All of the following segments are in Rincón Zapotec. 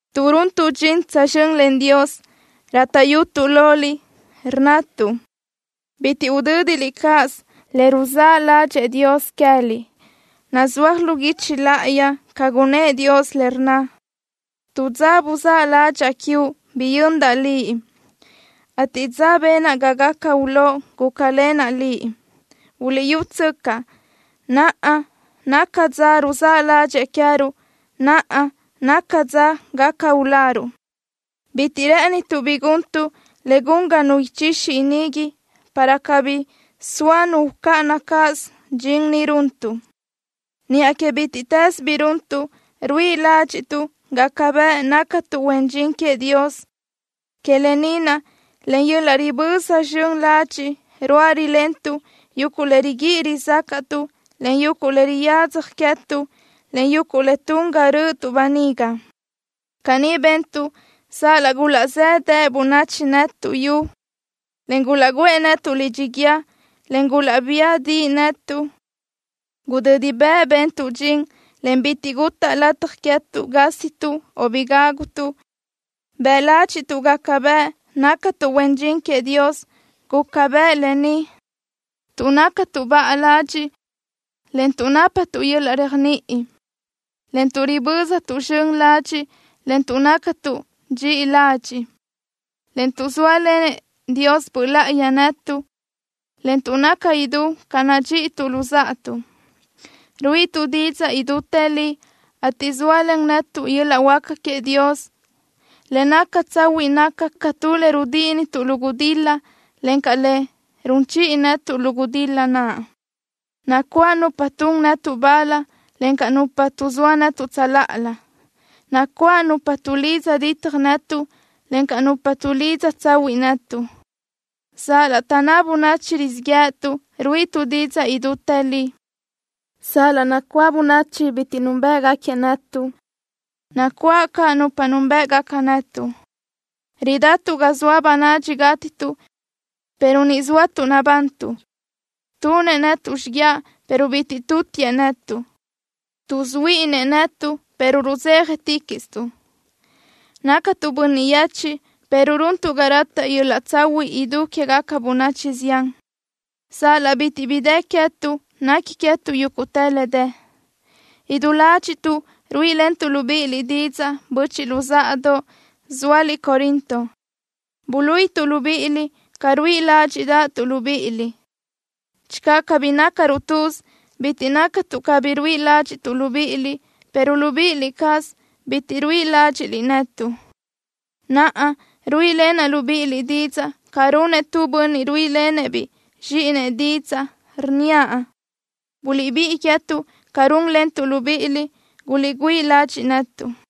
Tuʼ runtuʼ dxin tsözxö́n len Dios, rátaʼyutuʼ loliʼ, rnnatuʼ: Bitiʼ udö́diliʼ cáʼasö le ruzáʼ ládxëʼë Dios queë́liʼ. Nazúaj lu guichi láʼayi ca gunnë́ʼ Dios le rnna: Tu dza buzáʼ ládxaʼa quiuʼ, biyöndaʼ liʼ, ateʼ dza benaʼ ga gaca ulóʼ, gúcalenaʼ liʼ. ¡Buliʼyútsöcaʼ! ¡Naʼa naca dza ruzáʼ ládxëʼë queë́ruʼ! ¡Naʼa naca dza gaca uláruʼ! Bitiʼ rë́ʼënituʼ bi guntuʼ le gun ga nu ichixi inigui, para cabí soa nu ucáʼana cáʼasö dxin ni runtuʼ. Niʼa que bítiʼtës bi runtuʼ, ruíʼi ládxiʼtuʼ gaca bëʼ nácatuʼ huen dxin queëʼ Dios. Que lë ni naʼ, len yöl-laʼ riböza zxön ladxiʼ ruáʼ rilentuʼ yuguʼ le riguíʼi rizácaʼtuʼ, en yuguʼ le riyadzaj queë́tuʼ, en yuguʼ le tun ga rö́ʼötuʼ böniga. Caní bentuʼ sal-laʼ gulaʼzéʼedeʼe bönachi netuʼ yu, en gulaʼguʼë netuʼ lidxi guíë, en gulaʼbía diʼi netuʼ. Gudödi bëʼ bentuʼ dxin, en bitiʼ gutaʼ lataj queë́tuʼ gásituʼ o bi gágutuʼ. Bëʼ ládxiʼtuʼ gaca bëʼ nácatuʼ huen dxin queëʼ Dios. Guca bëʼ lë ni: Tuʼ nácatuʼ baʼa ladxiʼ, en tuʼ nápatuʼ yöl-laʼ réajniʼi, en tuʼ riböztuʼ zxön ladxiʼ, en tuʼ nácatuʼ dxiʼi ladxiʼ, en tuʼ zóalenëʼ Dios Böʼ Láʼayi netuʼ, en tuʼ naca idú ca nadxíʼituʼ luzáʼatuʼ. Ruíʼituʼ didzaʼ idútë li, ateʼ zóalen netuʼ yöl-laʼ huáca queëʼ Dios. Le naca tsahuiʼ naca ca tu le rudíʼinituʼ lu gudil-la, encaʼ le run chiʼi netuʼ lu gudil-la naʼ. Nacuáʼ nupa tun netuʼ bal, encaʼ nupa tuʼzóa netuʼ tsöláʼalö. Nacuáʼ nupa tuʼlidza ditaj netuʼ, encaʼ nupa tuʼlidza tsahuiʼ netuʼ. Sal-laʼ taʼnná bönachi rizíʼ yë́ʼëtuʼ, ruíʼituʼ didzaʼ idútë li. Sal-laʼ nacuáʼ bönachi bitiʼ núnbëʼgaquiëʼ netuʼ, nacuáʼ caʼ nupa núnbëʼgaca netuʼ. Ridatuʼ ga zoa bönadxi gátituʼ, pero ni zóatuʼ nabantuʼ. Tunëʼ netuʼ xíguiaʼ, pero bitiʼ tutiëʼ netuʼ. Tuʼsuhuíʼini netuʼ, pero rudzéjaticaʼstuʼ. Nácatuʼ bönniʼ yechiʼ, pero runtuʼ ga rataʼ yöl-laʼ tsahuiʼ idú quégaca bönachi zián. Sal-laʼ bitiʼ bi dë queë́tuʼ, nequi queë́tuʼ yúguʼtë le dë. Idú ládxiʼtuʼ ruíʼilentuʼ libíʼiliʼ didzaʼ, böchiʼ luzáʼadoʼ, zóaliʼ Corinto. Buluíʼituʼ libíʼiliʼ ca ruíʼi ládxiʼdaʼtuʼ libíʼiliʼ. Channö cabí nácaruʼ tuz bitiʼ naca tuʼ cabí ruíʼi ládxiʼtuʼ libíʼiliʼ, pero libíʼi cázaliʼ bitiʼ ruíʼi ládxiʼliʼ netuʼ. Naʼa, ruíʼilenaʼ libíʼiliʼ didzaʼ ca runëʼ tu bönniʼ ruíʼilenëʼ-biʼ zxíʼinëʼ didzaʼ, rnníaʼ: Buliʼbíʼi queë́tuʼ ca rúnlentuʼ libíʼiliʼ. Guliʼgüíʼ ladxiʼ netuʼ.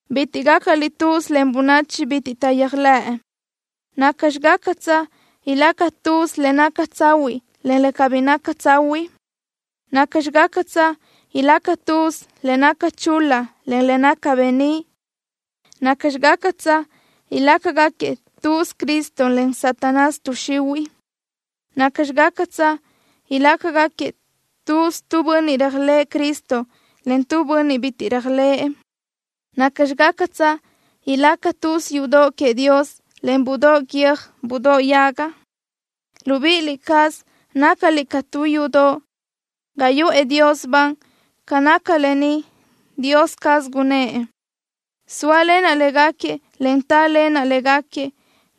Bitiʼ gácaliʼ tuz len bönachi bitiʼ taʼyéajlëʼ. ¿Nacxi gácatsö ilaca tuz le naca tsahuiʼ, en le cabí naca tsahuiʼ? ¿Nacxi gácatsö ilaca tuz le naca chul-la, en le naca beníʼ? ¿Nacxi gácatsö ilácagaquiëʼ tuz Cristo, en Satanás, tuʼ xihuiʼ? ¿Nacxi gácatsö ilácagaquiëʼ tuz tu bönniʼ réajlëʼë Cristo, en tu bönniʼ bitiʼ réajlëʼë? ¿Nacxi gácatsö ilaca tuz yudoʼ queëʼ Dios, en budóʼ guiö́j budóʼ yaga? Libíʼi cázaliʼ nácaliʼ ca tu yudoʼ ga yuʼë Dios ban. Ca naca lë ni, Dios caz gunnë́ʼ: Sóalenaʼ légaquiëʼ, en tálenaʼ légaquiëʼ.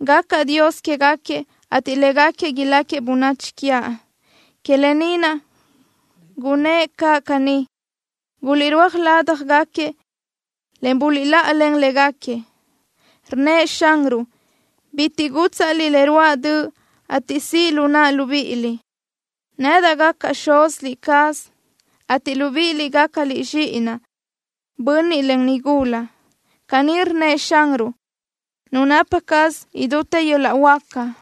Gacaʼ Dios quégaquiëʼ, ateʼ légaquiëʼ iláquiëʼ bönachi quiaʼ. Que lë ni naʼ, gunnë́ʼ caʼ caní: Guliʼrúaj ládjagaquiëʼ, en buliʼláʼalen légaquiëʼ. Rnnëʼ Xanruʼ: “Bitiʼ gútsaʼliʼ le ruáʼ döʼ, ateʼ siʼ lu naʼa libíʼiliʼ. Nedaʼ gacaʼ xuz cázaliʼ, ateʼ libíʼiliʼ gácaliʼ zxíʼinaʼ, bönniʼ, en nigula.” Caní rnnëʼ Xanruʼ, Nu napa caz idútë yöl-laʼ huáca.